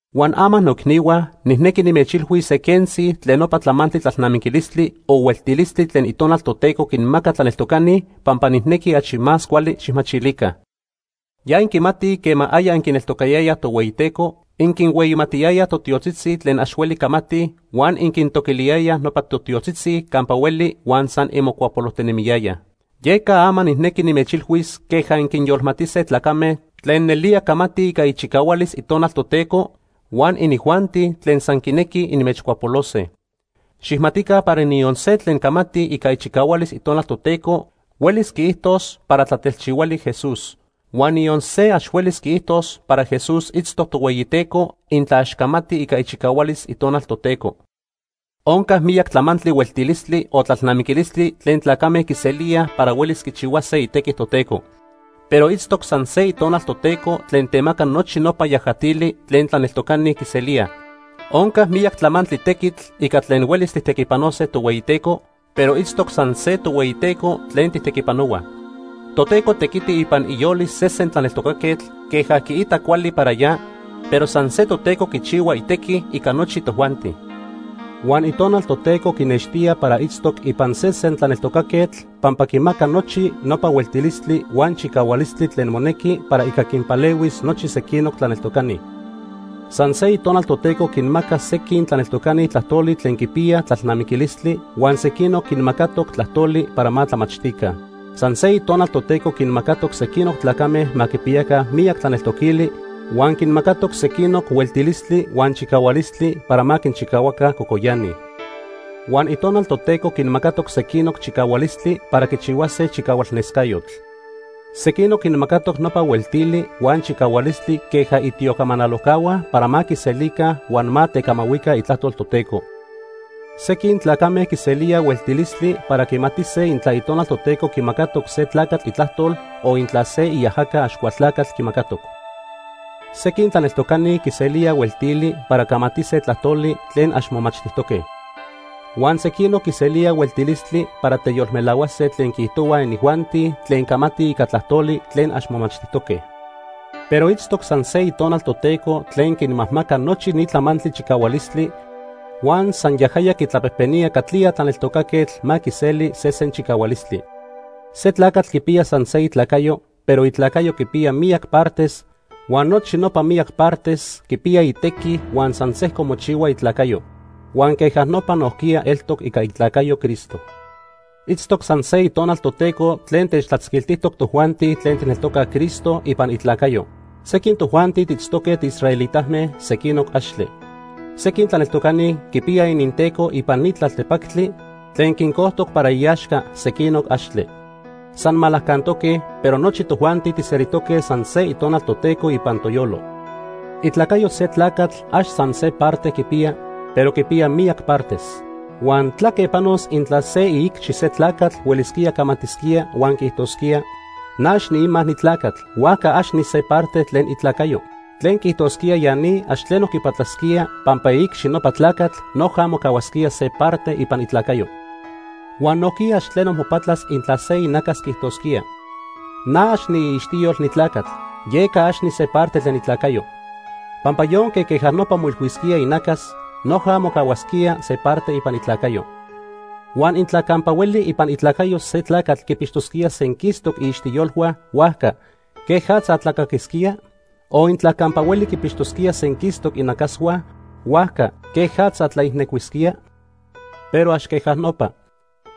Huan ama noicnihua, nijnequi nimechilhuis se quentzi tlen nopa tlamantli tlalnamiquilistli o hueltilistli tlen Itonal Toteco quinmaca tlaneltocani pampa nijnequi achi más cuali xijmachilica. Ya inquimatij quema aya inquineltocayayaj Tohueyiteco, inquinhueyimatiyayaj totiotzitzi tlen ax huelij camatij huan inquintoquiliyayaj nopa totiotzitzi campa hueli huan san inmocuapolojtinemiyayaj. Yeca ama nijnequi nimechilhuis queja inquinyolmatise tlacame tlen nelía camatij ica ichicahualis Itonal Toteco huan inijuanti tlen san quinequij inmechcuapolose. Xijmatica para niyon se tlen camati ica ichicahualis Itonal Toteco huelis quiijtos para tlatelchihuali Jesús. Huan niyon se ax huelis quiijtos para Jesús itztoc Tohueyiteco intla ax camati ica ichicahualis Itonal Toteco. Onca miyac tlamantli hueltilistli o tlalnamiquilistli tlen tlacame quiselíaj para huelis quichihuase itequi Toteco. Pero itztoc san se Itonal Toteco tlen temaca nochi nopa yajatili tlen tlaneltocani quiselíaj. Onca miyac tlamantli tequitl ica tlen huelis tijtequipanose Tohueyiteco, pero itztoc san se Tohueyiteco tlen tijtequipanohuaj. Toteco tequiti ipan iyolis sesen tlaneltocaquetl queja quiita cuali para ya, pero san se Toteco quichihua itequi ica nochi tojuanti. Huan Itonal Toteco quinextía para itztoc ipan sesen tlaneltocaquetl pampa quimaca nochi nopa hueltilistli huan chicahualistli tlen monequi para ica quinpalehuis nochi sequinoc tlaneltocani. San se Itonal Toteco quinmaca sequin tlaneltocani tlajtoli tlen quipiyaj tlalnamiquilistli, huan sequinoc quinmacatoc tlajtoli para ma tlamachtica. San se Itonal Toteco quinmacatoc sequinoc tlacame ma quipiyaca miyac tlaneltoquili huan quinmacatoc sequinoc hueltilistli huan chicahualistli para ma quinchicahuaca cocoyani. Huan Itonal Toteco quinmacatoc sequinoc chicahualistli para quichihuase chicahualnescayotl. Sequinoc quinmacatoc nopa hueltili huan chicahualistli queja itiocamanalojcahua para ma quiselica huan ma tecamahuica itlajtol Toteco. Sequin tlacame quiselíaj hueltilistli para quimatise intla Itonal Toteco quimacatoc se tlacatl itlajtol o intla se iajaca Axcualtlacatl quimacatoc. Sequin tlaneltocani quiselíaj hueltili para camatise tlajtoli tlen ax momachtijtoque. Huan sequinoc quiselíaj hueltilistli para teyolmelahuase tlen quiijtohuaj inijuanti tlen camatij ica tlajtoli tlen ax momachtijtoque. Pero itztoc san se Itonal Toteco tlen quinmajmaca nochi ni tlamantli chicahualistli huan san yajaya quitlapejpenía catlía tlaneltocaquetl ma quiseli sesen chicahualistli. Se tlacatl quipiya san se itlacayo, pero itlacayo quipiya miyac partes huan nochi nopa miyac partes quipiya itequi huan san sejco mochihua itlacayo. Huan queja nopa nojquiya eltoc ica itlacayo Cristo. Itztoc san se Itonal Toteco tlen techtlatzquiltijtoc tojuanti tlen tijneltocaj Cristo ipan itlacayo. Sequin tojuanti tiitztoque tiisraelitame, sequinoc axtle. Sequin tlaneltocani quipiyaj ininteco ipan ni tlaltepactli tlen quincojtoc para iaxca, sequinoc axtle, san malacantoque, pero nochi tojuanti tijselijtoque san se Itonal Toteco ipan toyolo. Itlacayo se tlacatl ax san se parte quipiya, pero quipiya miyac partes. Huan ¿tlaque panos intla se iicxi se tlacatl huelisquía camatisquía huan quiijtosquía: “Na ax niima ni tlacatl, huajca ax nise parte tlen itlacayo”? tlen quiijtosquía ya ni ax tleno quipatlasquía pampa iicxi nopa tlacatl noja mocahuasquía se parte ipan itlacayo. Huan nojquiya ax tleno mopatlas intla se inacas quiijtosquía: “Na ax niiixtiyol ni tlacatl, yeca ax nise parte tlen itlacayo.” Pampa yonque queja nopa moilhuisquía inacas, noja mocahuasquía se parte ipan itlacayo. Huan intla campa hueli ipan itlacayo se tlacatl quipixtosquía senquistoc iixtiyolhua, huajca ¿quejatza tlacaquisquía? O intla campa hueli quipixtosquía senquistoc inacashua, huajca ¿quejatza tlaijnecuisquía? Pero ax queja nopa.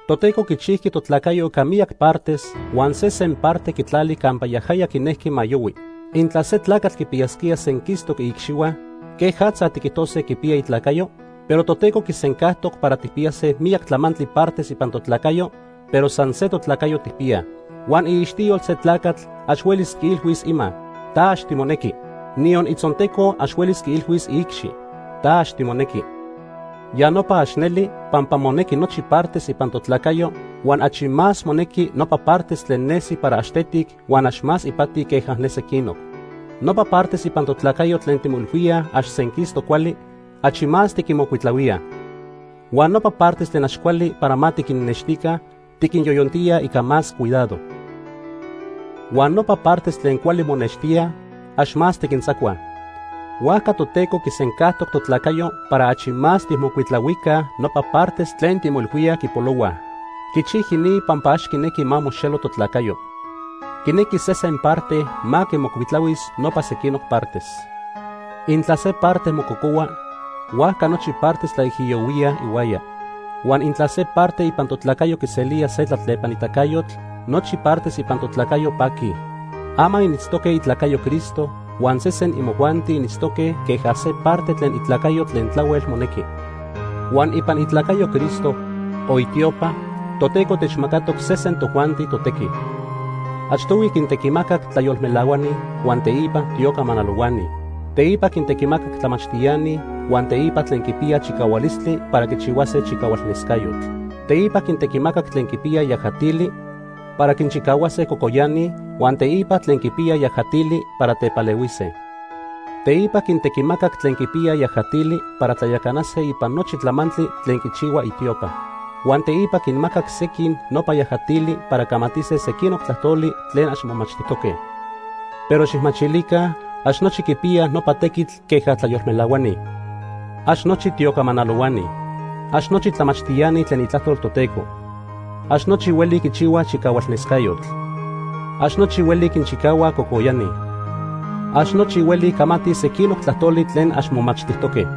Toteco quichijqui totlacayo ica miyac partes huan sesen parte quitlali campa yajaya quinejqui ma yohui. Intla se tlacatl quipiyasquía senquistoc iicxihua, ¿quejatza tiquijtose quipiya itlacayo? Pero Toteco quisencajtoc para tijpiyase miyac tlamantli partes ipan totlacayo, pero san se totlacayo tijpiyaj. Huan iixtiyol se tlacatl ax huelis quiilhuis ima: “Ta ax timonequi”, niyon itzonteco ax huelis quiilhuis iicxi: “Ta ax timonequi.” Ya nopa ax neli, pampa monequi nochi partes ipan totlacayo, huan achi más monequi nopa partes tlen nesi para ax tetic huan ax más ipati queja ne sequinoc. Nopa partes ipan totlacayo tlen timoilhuíaj ax senquistoc cuali, achi más tiquinmocuitlahuíaj. Huan nopa partes tlen ax cuali para ma tiquinnextica, tiquinyoyontíaj ica más cuidado. Huan nopa partes tlen cuali monextíaj, ax más tiquintzacuaj. Huajca Toteco quisencajtoc totlacayo para achi más tijmocuitlahuica nopa partes tlen timoilhuíaj quipolohuaj. Quichijqui ni pampa ax quinejqui ma moxelo totlacayo. Quinequi sesen parte ma quimocuitlahuis nopa sequinoc partes. Intla se parte mococohua, huajca nochi partes tlaijiyohuíaj ihuaya. Huan intla se parte ipan totlacayo quiselía se tlatlepanitacayotl, nochi partes ipan totlacayo paquij. Ama initztoque itlacayo Cristo huan sesen imojuanti initztoque queja se parte tlen itlacayo tlen tlahuel monequi. Huan ipan itlacayo Cristo, o itiopa, Toteco techmacatoc sesen tojuanti totequi. Achtohui quintequimacac tlayolmelahuani huan, teipa tiocamanalohuani. Teipa quintequimacac tlamachtiani huan teipa tlen quipiyaj chicahualistli para quichihuase chicahualnescayotl. Teipa quintequimacac tlen quipiyaj yajatili para quinchicahuase cocoyani, huan teipa tlen quipiyaj yajatili para tepalehuise. Teipa quintequimacac tlen quipiyaj yajatili para tlayacanase ipan nochi tlamantli tlen quichihua itiopa. Huan teipa quinmacac sequin nopa yajatili para camatise sequinoc tlajtoli tlen ax momachtijtoque. Pero xijmachilica, ax nochi quipiyaj nopa tequitl queja tlayolmelahuani. Ax nochi tiocamanalohuani. Ax nochi tlamachtiani tlen Itlajtol Toteco. Ax nochi huelij quichihuaj chicahualnescayotl. Ax nochi huelij quinchicahuaj cocoyani. Ax nochi huelij camatij sequinoc tlajtoli tlen ax momachtijtoque.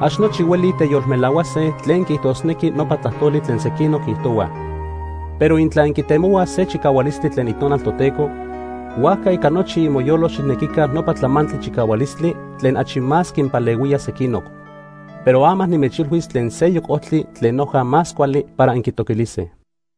Ax nochi huelij teyolmelahuase tlen quiijtosnequi nopa tlajtoli tlen sequinoc quiijtohuaj. Pero intla inquitemohuaj se chicahualistli tlen Itonal Toteco, huajca ica nochi imoyolo xijnequica nopa tlamantli chicahualistli tlen achi más quinpalehuía sequinoc. Pero ama nimechilhuis tlen seyoc ojtli tlen noja más cuali para inquitoquilise.